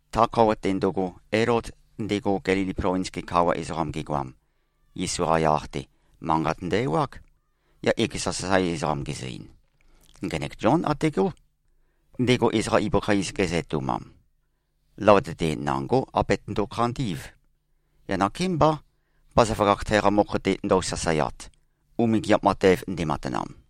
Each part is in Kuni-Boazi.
Ta khøuwa-te ndøgo, Elod ndego, Gelili plovins-ge kawa ezoqam gegoam, Yesu-qa yaq-te, manqat ndø-ewág. Yaq ekeza sasae ezoqam gezø-ein, “Ngenek Zión ategó, ndego ezoqa ibøkha iz gezø-etoumam. Løvøte-te nangó abetøndo-khandí꞉v. Yaq nakémbá, bazaføgakh teqa mokho-te ndøu-sasaeat, umingiap matev ndematanam.”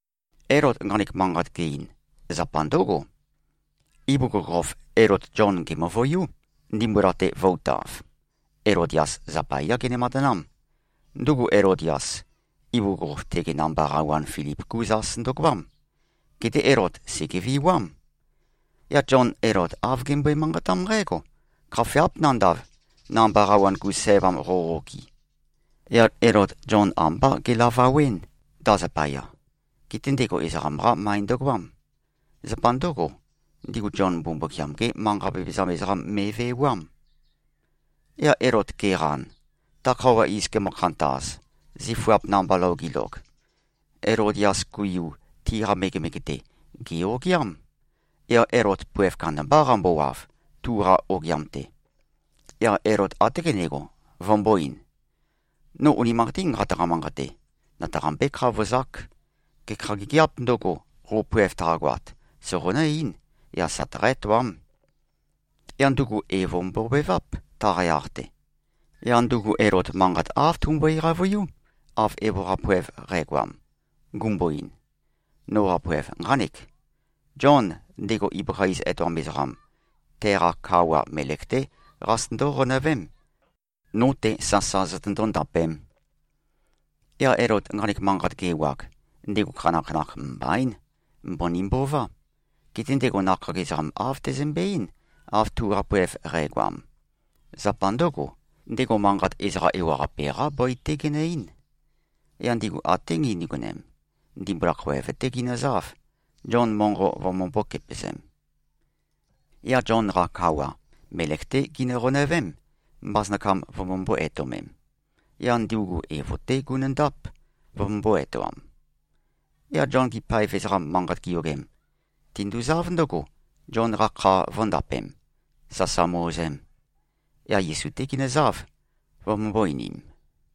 Elod nqanek manqat ge-ein, zapa ndǿgo. Ibugukhokhof Elod Zion gèmøvøiú, ndimbula-te vø̄-utav. Elodias zapayá gene-matanám. Ndugu Elodias, ibugukhokhof tege namba qawan Filip-gú zas ndøgoám. Geté Elod sègeviwám. Yaq Zion Elod āv gembøe-manqatám nqǽgo, “Khafeáp nandav, namba qawan-gu sævam qoqo-okɨ.” Yaq Elod Zion ambá gelavawɨ́n, ta zapaya. Geté ndego ezoqam-qá møe ndøgoám. Zapa ndǿgo, ndigu Zion Mbumbukiam-gé manqa vevezam ezoqam me꞉vewám. Yaq Elod ge꞉qan, ta khøuwa iz gemø-khantaz, zifuap namba lou gilog, Elodias-gu yu tiqa megemege-te, gè-ogiám. Yaq Elod poev kandambá qambowav, tuqa ogiam-te. Yaq Elod até gendego, vømbō-ein, “No unimanqatín nqataqa-manqate. Nøtaqambé-khavozák. Gekha gigiāp ndøgo, qo poev taqagoat, soqonǿ-eín, yaq søtaqá-etoám.” Yaq ndugu evo mbobeváp, taqa yaq-te. Yaq ndugu Elod manqat āv tumbøe-qavøiú, av evo-qa poev qægoam, gumbo-ein, “Noqa poev nqánek. Zion, ndego ibøkha iz etoam ezoqam, teqa kawa melek-té qazøtøndó-qonøvém, no-te sasa zotøndó-ndapēm.” Yaq Elod nqanek manqat ge-ewag, ndego khanakhanakh mbaín. Mbøni mbová. Geté ndego nakhag ezoqam āv tezømbe-eín, av tuqa poev qægoam. Zapa ndǿgo, ndego manqat ezoqa ewaqape-qá bøi-té genø-eín. Yaq ndigu até gindigonem, ndimbula khoev-té ginøzáv, Zion monqo vømømbō-kepøzem. Yaq Zion-qa kawa, melek-té ginø-qonøvém, mbasønakam vømømbó-etøomem. Yaq ndugu evo-té gunøndáp, vømømbó-etoam. Yaq Zion-gi paev ezoqam manqat giyogem, tinduzáv ndǿgo, Zion-qa kha vø̄ndapem, sasa mø-ozem. Yaq Yesu-té ginøzáv, vømømbō-einim.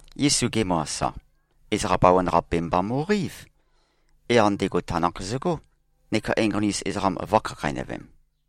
Yesu gemø-asa, ezoqa bawan-qape mba mo꞉qeív. Yaq ndego tanakh zøgó, neka enqoni-us ezoqam vø̄khakheinøvem.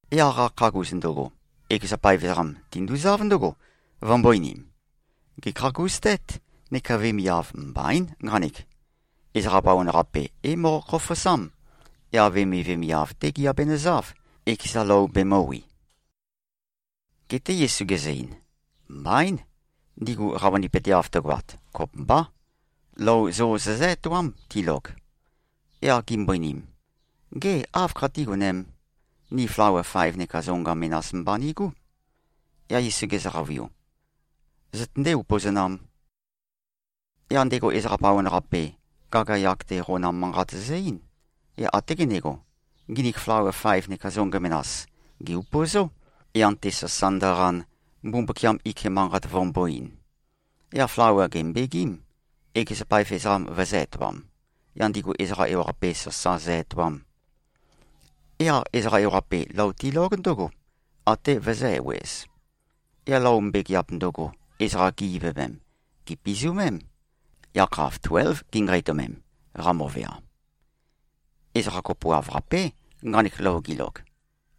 Yaq qakhagus ndøgo, ekeza paev ezoqam tinduzáv ndǿgo, vømbō-einim, “Gèkhagustét, neka vemiav mbaín, nqanek. Ezoqa bawan-qape é-moqo-khofosám. Yaq vemivemiav-té giabenøzáv, ekeza lou bemø̄wi.” Geté Yesu gezø-ein, “Mbaín. Ndigu qavønipøteav tøgoat, kopømbá. Lou zo zozǿ-etoám, tilog.” Yaq gimbo-einim, “Gê, áv khatígonēm? Ni flawa faev neka zonga menas mba nigú.” Yaq Yesu gezø-qavøiu, “Zøtøndé-upøzonām.” Yaq ndego ezoqa bawan-qape, gagayag-te qonam manqat zø-eín. Yaq até gendego, nginik flawa faev neka zonga menas, gè-upøzó, yan-te sasa ndøqan, Mbumbukiam ike manqat vømbō-ein. Yaq flawa gèmbegím, ekeza paev ezoqam vøzø̄-etoam, yaq ndigu ezoqa ewaqape sasa zø-etoam. Yaq ezoqa ewaqape lou tilóg ndǿgo, até vøzø̄-ewez. Yaq lou mbegeap ndøgo, ezoqa gi-ivøvem, gèpizumém. Yakhav tuélv ginqeitømem, qamøvea. Ezoqa kopoav-qapé, nqanek lou gilog.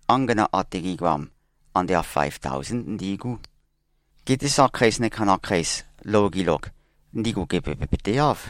Angana ate gi꞉goam, ande āv faev taosén ndi꞉gú. Geté sakheis neka nakheis, lou gilog, ndigu gevebøpøteáv.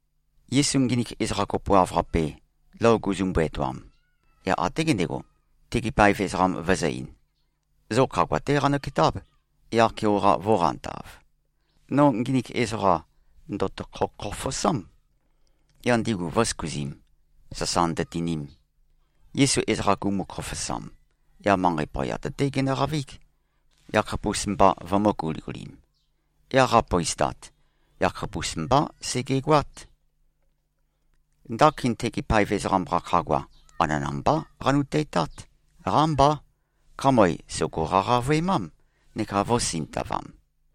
Yesu nginik ezoqa kopoav-qape, lou guzumbu-etoam, yaq até gendego, tegi paev ezoqam vøzø̄-ein, “Zo khagua-té qanøketáb, yaq-keoqa vō꞉qantav. No nginik ezoqa ndø̀tokho-khofosám.” Yaq ndigu vø̄søkuzim, sasa ndøtinim. Yesu ezoqa gumu-khofosam, yaq manqei poyat-té genøqavíg, yakhapus-mba vømø̄-guligulim. Yaq qapøistat, yakhapus mbá segegoát. Ndakin tegi paev ezoqam-qa khagua, anana-mbá qanuteitát. Qámbá. Khamøe sògo-qaqavøemám neka vø̄sintavam.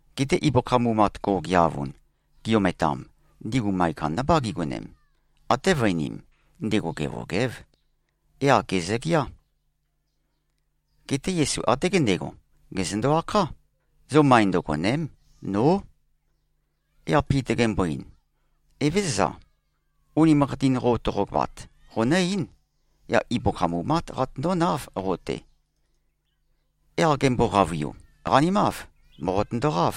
Geté ibøkha mumat go꞉geavun, gi-ometam, ndigu møe kandambá gigonem. Até vøe-einim, ndego gevøgév. Yaq gèzøgeá. Geté Yesu até gendego, gèzøndo-akhá, “Zo møe ndøgòne᷄m. Nó!” Yaq Pita gembo-ein, “Evézøza. Unimanqatin qo toqogoat, qonǿ-eín. Yaq ibøkha mumát qatøndónáv qo-te.” Yaq gembo-qavøiu, “Qanimáv. Mòqotøndoqáv.”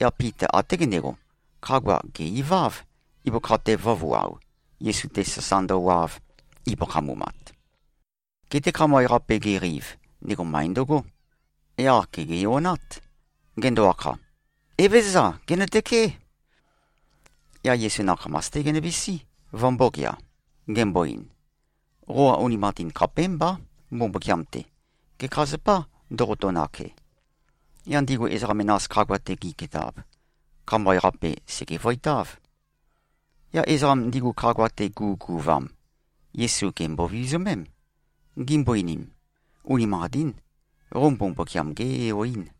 Yaq Pita até gendego, khagua gè-iváv, ibøkha-te vø̄vuao, Yesu-te sasa ndøwav, ibøkha mumat. Geté khamøe-qape geqeiv, ndego møe ndøgó. Yaq gègeonát. Gendo-akha, “Evézøza. Gènøtøké.” Yaq Yesu nakhamas-té genøvisí, vømbōgea. Gembo-ein, “Qoqa unimanqatin khapémbá, Mbumbukiam-te. Gekha zapâ ndoqoto-nake?” Yaq ndigu ezoqa menas khagua-te gi꞉ketab, khamøe-qape sègevøitáv. Yaq ezoqam ndigu, khagua-te gu꞉guvam, Yesu gèmbo-vizumém. Gimbo-einim, “Unimanqatín. Qo uni Mbumbukiam-gé-Yo-ín.”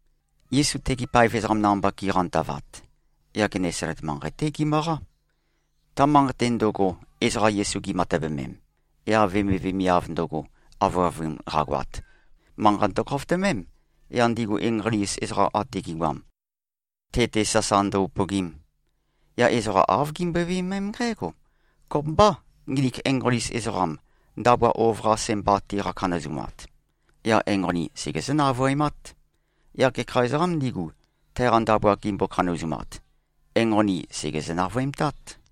Yesu tegi paev ezoqam namba giqantavat, yaq Genesalet manqei-té gimøqá. Ta manqei-te ndøgo, ezoqa Yesu gimatøvemem, yaq vemivemiav ndøgo, avøavun qagoat, manqa ndøkhofotømém, yaq ndigu enqoni-us ezoqa ate gi꞉goam, te-te sasa ndo-upøgim. Yaq ezoqa āv gimbøe-viømém nqǽgo, “Kopømbâ, nginik enqoni-us ezoqam, ndabua ov-qase mba tiqa-khanøzumat. Yaq enqoni segezǿ-navøemát.” Yaq gekha ezoqām ndigu, teqa ndabua gimbo-khanazumat, enqoni sègezø-navøemtát.